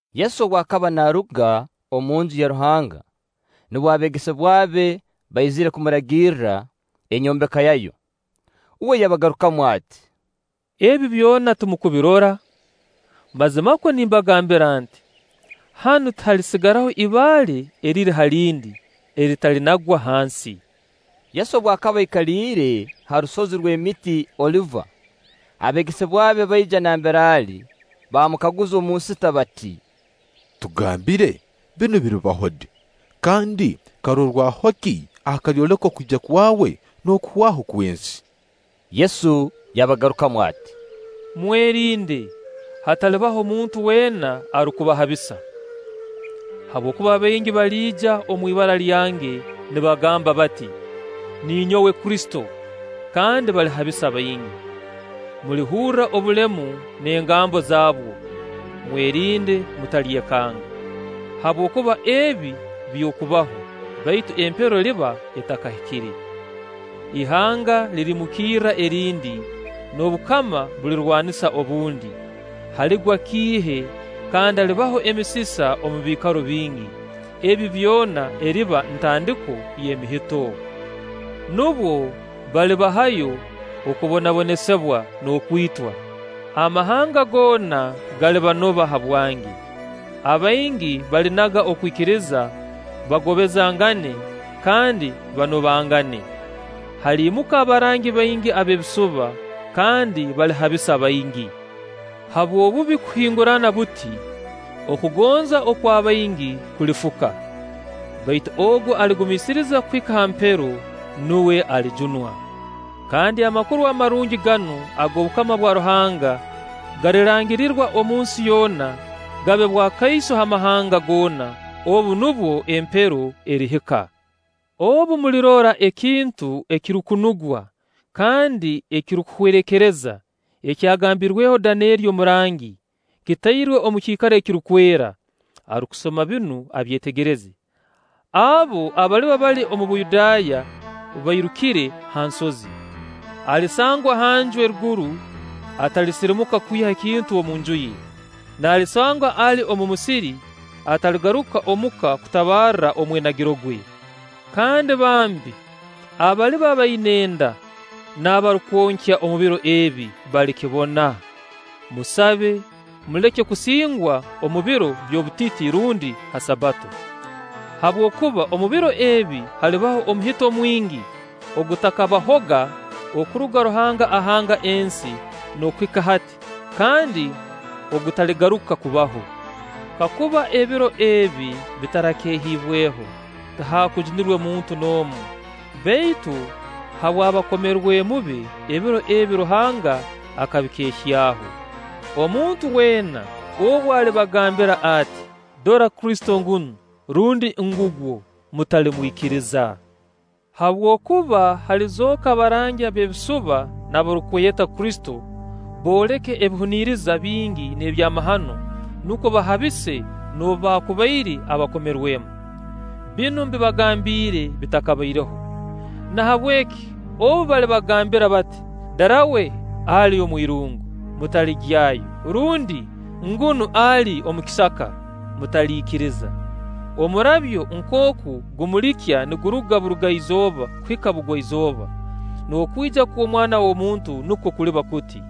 Yesu obu akaba naaruga omu Nju ya Ruhanga, nubwo abeegesebwa be baizire kumuragirra enyombeka yayo. Uwe yabagarukamu ati: “Ebi byona timurukubirora? Mazima nimbagambira nti: Hanu tihalisigaraho ibaale eriri ha lindi, eritalinagwa hansi.” Yesu obu akaba aikaliire ha rusozi rw'emiti Oliva, abeegesebwa be baija nambere ali baamukaguza omu nsita bati: “Tugambire, binu biribaho di, kandi karorwaho ki akalyoleka okwija kwawe n'okuhwaho kw'ensi?” Yesu yabagarukamu ati: “Mwerinde, hatalibaho muntu weena arukubahabisa. Habwokuba baingi abaliija omu ibara lyange, nibagamba bati: ‘Ninyowe Kristo’, kandi balihabisa baingi. Mulihurra obulemu n'engambo zabwo; mwerinde mutalyekanga; habwokuba ebi by'okubaho, baitu empero eriba etakahikire. Ihanga lirimukirra erindi, n'obukama bulirwanisa obundi, haligwa kiihe kandi halibaho emisisa omu biikaro bingi. Ebi byona eriba ntandiko y'emihito. “Nubwo balibahayo okubonabonesibwa n'okwitwa; amahanga goona galibanoba habwange. Abaingi balinaga okwikiriza, bagobezangane, kandi banobangane. Haliimuka abarangi baingi ab'ebisuba kandi balihabisa baingi. Habw'obubi kuhingurana buti, okugonza okwa baingi kulifuka. Baitu ogu aligumiisiriza kuhika ha mpero, nuwe alijunwa. Kandi Amakuru Amarungi ganu ag'obukama bwa Ruhanga galirangirirwa omunsi yoona, gabe bwakaiso ha mahanga goona; obu nubwo empero erihika.” “Obu mulirora ekintu ekirukunugwa kandi ekirukuhwerekereza, ekyagambirweho Daneeri omurangi, kitairwe omu kiikaro ekirukwera (arukusoma binu abyetegereze), abo abaliba bali omu Buyudaaya bairukire ha nsozi; alisangwa hanju eruguru, atalisirimuka kwiha ekintu omunju ye; n'alisangwa ali omu musiri, ataligaruka omu ka kutabarra omwenagiro gwe. Kandi bambi, abaliba baina enda n'abarukwonkya omu biro ebi balikibona! Musabe muleke kusingwa omu biro by'obutiti rundi ha Sabbato. Habwokuba omu biro ebi halibaho omuhito mwingi ogutakabahoga okuruga Ruhanga ahanga ensi n'okuhika hati, kandi ogutaligaruka kubaho. Kakuba ebiro ebi bitarakeehiibweho, tihaakujunirwe muntu n'omu; baitu habw'abakomerwemu be, ebiro ebi Ruhanga akabikeehyaho. Omuntu weena obu alibagambira ati: ‘Dora Kristo ngunu!’ Rundi: ‘Ngugwo!’ Mutalimwikiriza. Habwokuba halizooka abarangi ab'ebisuba n'abarukweyeta Kristo, booleke ebihuniriza bingi n'ebyamahano, nukwo bahabise noobu baakubaire abakomerwemu. Binu mbibagambiire bitakabaireho. Nahabweki obu balibagambira bati: ‘Darawe ali omwirungu,’ mutaligyayo. Rundi: ‘Ngunu ali omu kisiika’, mutaliikiriza. Omurabyo nkooku gumulikya niguruga Burugaizooba kuhika Bugwaizooba, n'okwija kw'Omwana w'omuntu nukwo kuliba kuti.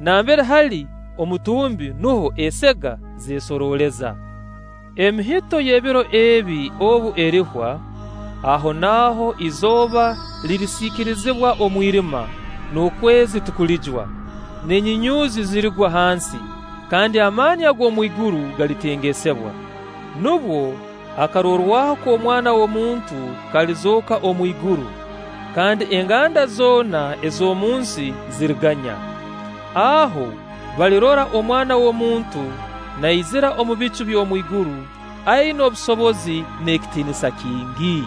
Nambere hali omutumbi, nuho esega zeesorooleza.” “Emihito y'ebiro ebi obu erihwa, ahonaaho izooba lirisiikirizibwa omwirima, n'okwezi tikulijwa, n'enyunyuuzi zirigwa hansi, kandi amaani ag'omwiguru galitengesebwa. Nubwo akarorwaho k'Omwana w'omuntu kalizooka omu iguru, kandi enganda zoona ez'omunsi ziriganya. Aho balirora Omwana w'omuntu naizira omu bicu by'omwiguru, aina obusobozi n'ekitiinisa kingi.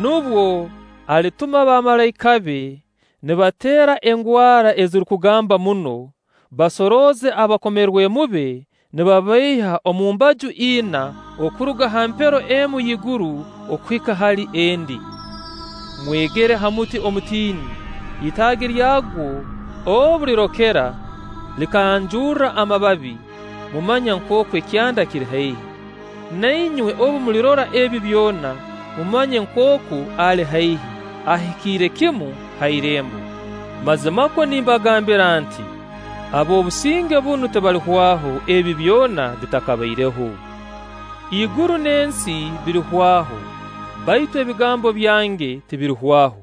Nubwo alituma bamalaika be nibateera engwara ezirukugamba muno, basorooze abakomerwemu be nibabaiha omu mbaju ina, okuruga ha mpero emu y'iguru okuhika hali endi.” “Mwegere ha muti omutini, itaagi lyagwo obu lirokera, likanjurra amababi, mumanya nkooku ekyanda kiri haihi. Na inywe obu mulirora ebi byona, mumanye nkooku ali haihi, ahikiire kimu ha irembo. Mazimakwo nimbagambira nti: Ab'obusinge bunu tibalihwaho, ebi byona bitakabaireho. Iguru n'ensi birihwaho, baitu ebigambo byange tibirihwaho.”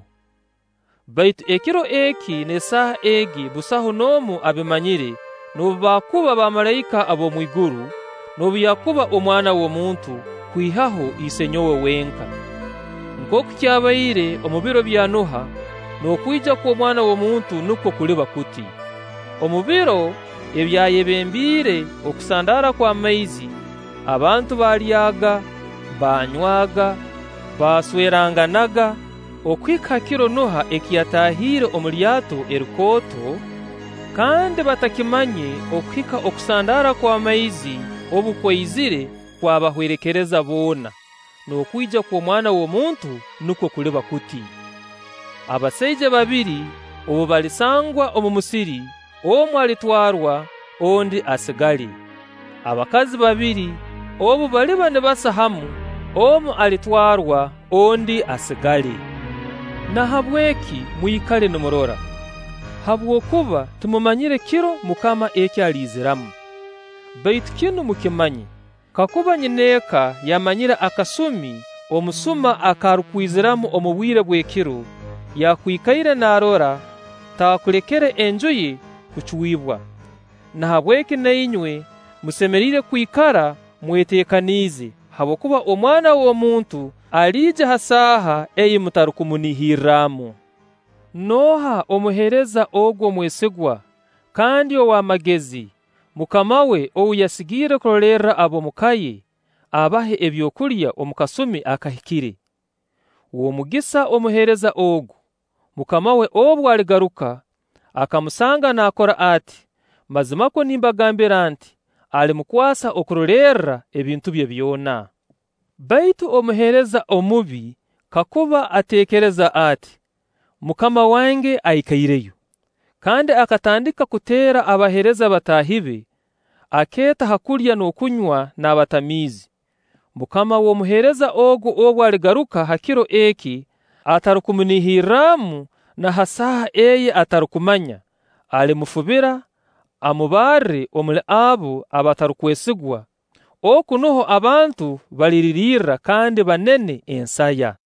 “Baitu ekiro eki n'esaaha egi busaho n'omu abimanyire, noobu baakuba bamalaika ab'omu iguru, noobu yakuba Omwana w'omuntu, kwihaho Isenyowe wenka. Nkooku kyabaire omu biro bya Noha, n'okwija kw'Omwana w'omuntu nukwo kuliba kuti. Omu biro ebyayebembiire okusandaara kw'amaizi, abantu baalyaaga, baanywaga, basweranganaga, okuhika ha kiro Noha eki yataahiireho omu lyato erikooto, kandi batakimanye okuhika okusandaara kw'amaizi obu kwaizire kwabahwerekereza boona; n'okwija kw'Omwana w'omuntu nukwo kuliba kuti. Abasaija babiri obu balisangwa omu musiri: omu alitwarwa, ondi asigale. Abakazi babiri obu baliba nibasa hamu: omu alitwarwa, ondi asigale. Nahabweki mwikale nimurora, habwokuba timumanyire kiro MUKAMA eki aliiziramu. Baitu kinu mukimanye, kakuba nyineeka yamanyire akasumi omusuma ak'arukwiziramu omu bwire bw'ekiro, yaakwikaire naarora, taakulekere enju ye kucwibwa. Nahabweki na inywe musemeriire kwikara mweteekaniize; habwokuba Omwana w'omuntu aliija ha saaha ei mutarukumunihirranu.” “Nooha omuheereza ogu omwesigwa kandi ow'amagezi, mukama we ou yasigiire kurolerra ab'omu ka ye, abahe ebyokulya omu kasumi akahikire? W'omugisa omuheereza ogu, mukama we obu aligaruka, akamusanga naakora ati! Mazimakwo nimbagambira nti: Alimukwasa okurolerra ebintu bye byona. Baitu omuheereza omubi kakuba ateekereza ati: ‘Mukama wange aikaireyo’, kandi akatandika kuteera abaheereza bataahi be, akeeta ha kulya n'okunywa n'abatamiizi. Mukama w'omuheereza ogu obu aligaruka ha kiro eki atarukumunihirramu na ha saaha ei atarukumanya, alimufubira, amubarre omuli abo abatarukwesigwa; oku nuho abantu baliririrra kandi banene ensaya.”